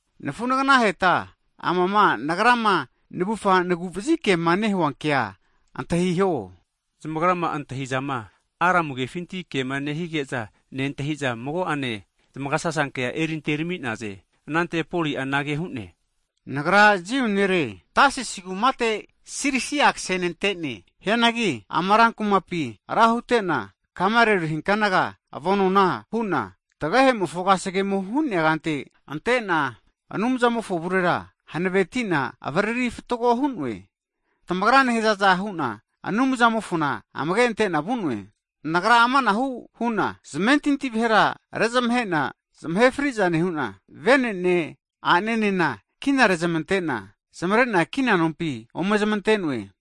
Nafu'nafaheta, amama nagrama navufa nagu'vazi kema nehua kea antahiho. Zamagrama antahizama, Aramu (Hibru) kefinti kema nehige'za nentahi'za, mago'ane zamagasasankea eri anterami'naze. Anante Poli'a anage hu'ne, nagra Jiu nere, Tasis kumate Silisia ksenante'ne. Hianagi ama ran kumapi ra hutena Gamalieli hikanaga avonona hu'na, tagehemofo kasegemo hu'nea kante ante'na Anumzamofo avu'avara hanaveti'na avariri fatgo hu'noe. Tamagrama nehazaza hu'na Anumzamofona amage ante'na vu'noe. Nagra amanahu hu'na, zamentinti vahera nezamahe'na, zamahe fri'za nehu'na, vene'ne a'nenena kina rezamante'na zamare'na kina nompi ome zamante'noe.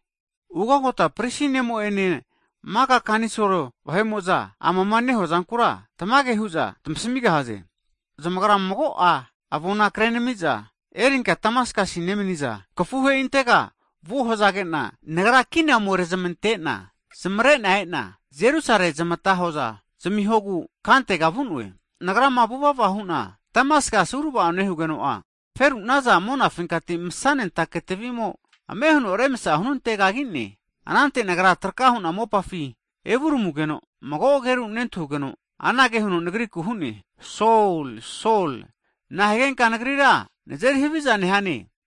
Ugagota prisi ne'mo'ene, maka kanisol (senhidren) vahe'mo'za, amama nehuazankura tamage hu'za tamasmigahaze. Zamagra mago'a avona kre'nami'za erinka Damaskasi nemniza kafuhe'intega vuo hazage'na, nagra kina ome rezmante'na zamare'na e'na, Jerusale zamata hoza zamihogu kantega vu'noe. Nagrama vuvava hu'na Damaskasi urava'o nehugeno'a, feru'naza monafinkati msa'nentake tvi'mo ame' huno remsa hunante kagine. Anante nagra traka hu'na mopafi evuramugeno, mago ageru nentahugeno anage huno nagriku hu'ne, Sol, Sol, na'a higenka Nagrira nazeri havizana nehane?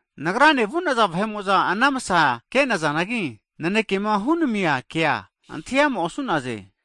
Nagrane vu'naza vahe'mo'za ana msa ke'nazanagi, nanekema hunamia kea antahi ama osu'naze.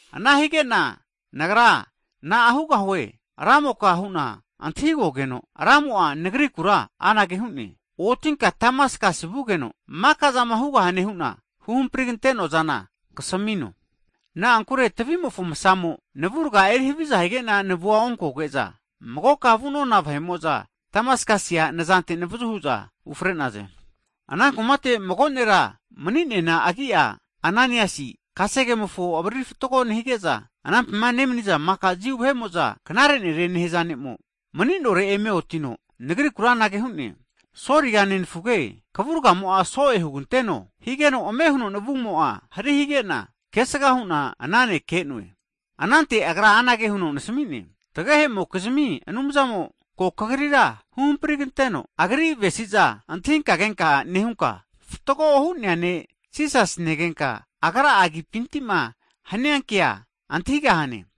Ana hige'na nagra na'a hugahue Ramoka? hu'na antahigogeno, Ramo'a nagrikura anage hu'ne, Otinka Damaskasi vugeno, maka'zama hugahane hu'na huhampri kante'noa'zana kasamino. Na'ankure tavi'mofo msamo navurga erihaviza hige'na navua onkoge'za, magokama vu'nona vahe'mo'za Damaskasia nazante navazu hu'za ufre'naze. Ana kumate mago nera mani'neana agi'a Ananaisi kasegemofo avariri fatgo nehige'za, anampima nemni'za maka Jiu vahe'mo'za, knare nere nehaza ne'mo, mani'nore eme otino nagriku anage hu'ne, Soliga nenafuge, kavurgamo'a so'e huganteno! Higeno ame' huno navumo'a hari hige'na kesga hu'na ana ne' ke'noe. Anante agra anage huno nasami'ne, tagehe'mokizmi Anumzamo ko kagrira huhampriganteno, Agri avesi'za antahinka kenka nehunka, Fatgo Hu'nea Ne' Jisasi negenka, Agra'a agipinti'ma hania kea antahigahane.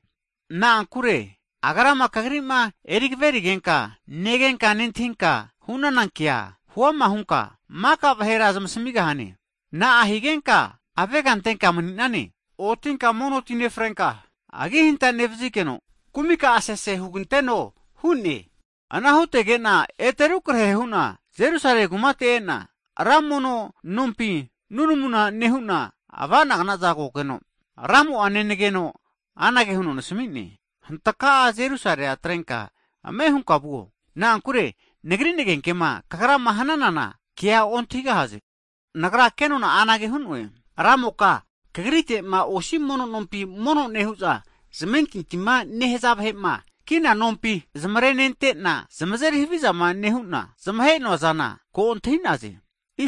Na'ankure Agrama kagri'ma eri kaverigenka, negenka nentahinka hu'nana kea, huama hunka maka vahera zamasmigahane. Na'a higenka avega antenka mani'nane? Otinka mono ti nefrenka, agihanta nevazigeno kumi ka'a sese huganteno hu'ne. Ana hutege'na ete rukarahe hu'na Jerusale kumate e'na, ranmono nompi nunamu nehu'na ava'nagna'za kogeno, Ramo'a negogeno anage huno nasami'ne, Hantaka'a Jerusalea atrenka ame' hunka vuo, na'ankure Nagri nagenkema kagrama hanana kea ontahigahaze. Nagra kenona'a anage hu'noe, Ramoka Kagrite'ma osi mono nompi mono nehu'za, zamentintima nehaza vahe'ma kina nompi zamare nente'na, zamazeri havizama nehu'na zamahe'noazana ko antahi'naze.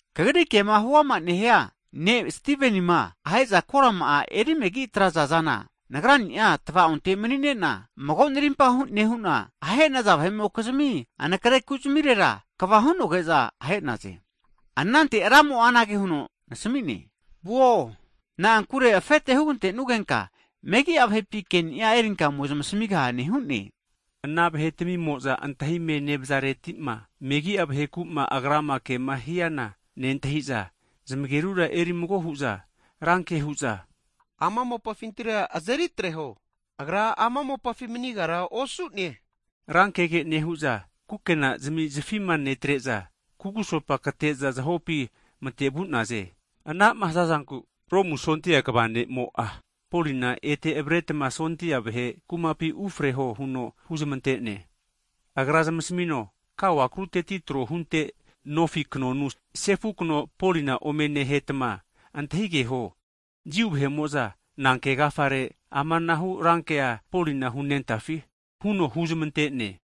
Kagri kema huama nehia ne'ma Stivenima ahe'za korama'a erimegi atraza'zana, nagrani'a tava'onte mani'nena, mago narimpa nehu'na, ahe'naza vahe'mokizmi anakare ku'zamirera kava hu'nogeza ahe'naze. Anante Ramo'a anage huno nasami'ne. Vuo! Na'ankure afete hugante'nugenka megi'a vahepi ke'ni'a erinka ome zamasmigahane hu'ne. Ana vahetamimo'za antahime nevazareti'ma, megi'a vaheku'ma agrama kema hiana nentahi'za zamagerura eri mago hu'za ranke hu'za, ama mopafintira azeri atreho! Agra ama mopafi manigara osu'ne! Rankege nehu'za, kukena'zami zafima netare'za, kugusopa kate'za zahopi mate vu'naze. Ana'ma haza'zanku Romu sondia kva ne'mo'a, Polina ete avaretma sondia vahe kumapi ufreho huno huzmante'ne. Agra zamasmino kao akaruteti trohunte nofi knonu sefu kno Polina ome nehetma antahigeho, Jiu vahe'mo'za nanke agafare amanahu rankea Polina hunentafi, huno huzmante'ne.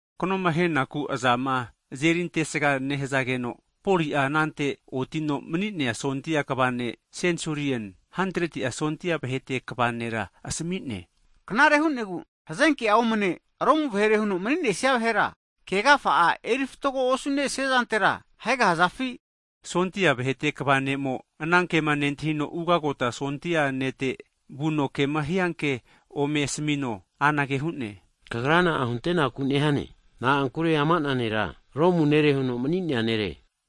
Knoma ahenaku azama azeri antesga nehazageno, Poli'a anante otino mani'nea sondia kva ne' (sensulien, hantretia sondia vahete kva nera), asami'ne, Knare hu'negu hazenke'a omane Romu vahere huno maninesia vahera ke agafa'a eri fatgo osu'nesiazantera ahegahazafi? Sondia vahete kva ne'mo, ana kema nentahino, ugagota sondia nete vuno, kema hianke ome asamino, anage hu'ne, kagra na'a huntenaku nehane? Na'ankure ama'na nera Romu nere huno mani'nea nere.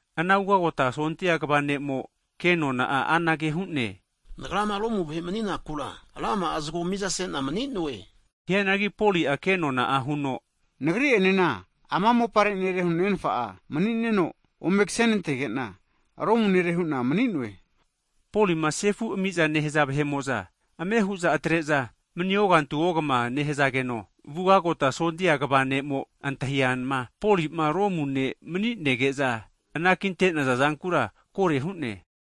Ana ugagota sondia kva ne'mo, kenona'a anage hu'ne, Nagrama Romu vahe mani'nakura rama'a zgo mizase'na mani'noe. Hianagi Poli'a kenona'a huno nagri'enena ama mopare nere huno nenfa'a mani'neno, ome kasenantege'na, Romu nere hu'na mani'noe, Polima sefu ami'za nehaza vahe'mo'za ame hu'za atre'za mani ogantu ogama nehazageno, ugagota sondia kva ne'mo antahiama Poli'ma Romu ne' mani'nege'za anakinte'naza zankura kore hu'ne.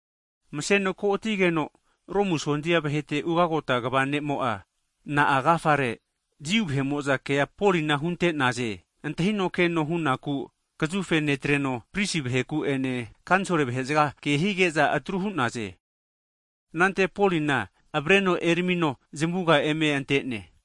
Maseno ko'atigeno Romu sondia vahete ugagota kva ne'mo'a, Na'a agafare Jiu vahe'mo'za kea Polina hunte'naze antahino keno hunaku kazufe netreno, prisi vaheku'ene kanisol vahe'zga ke hige'za atru hu'naze. Anante Polina avareno eramino zamuga eme ante'ne.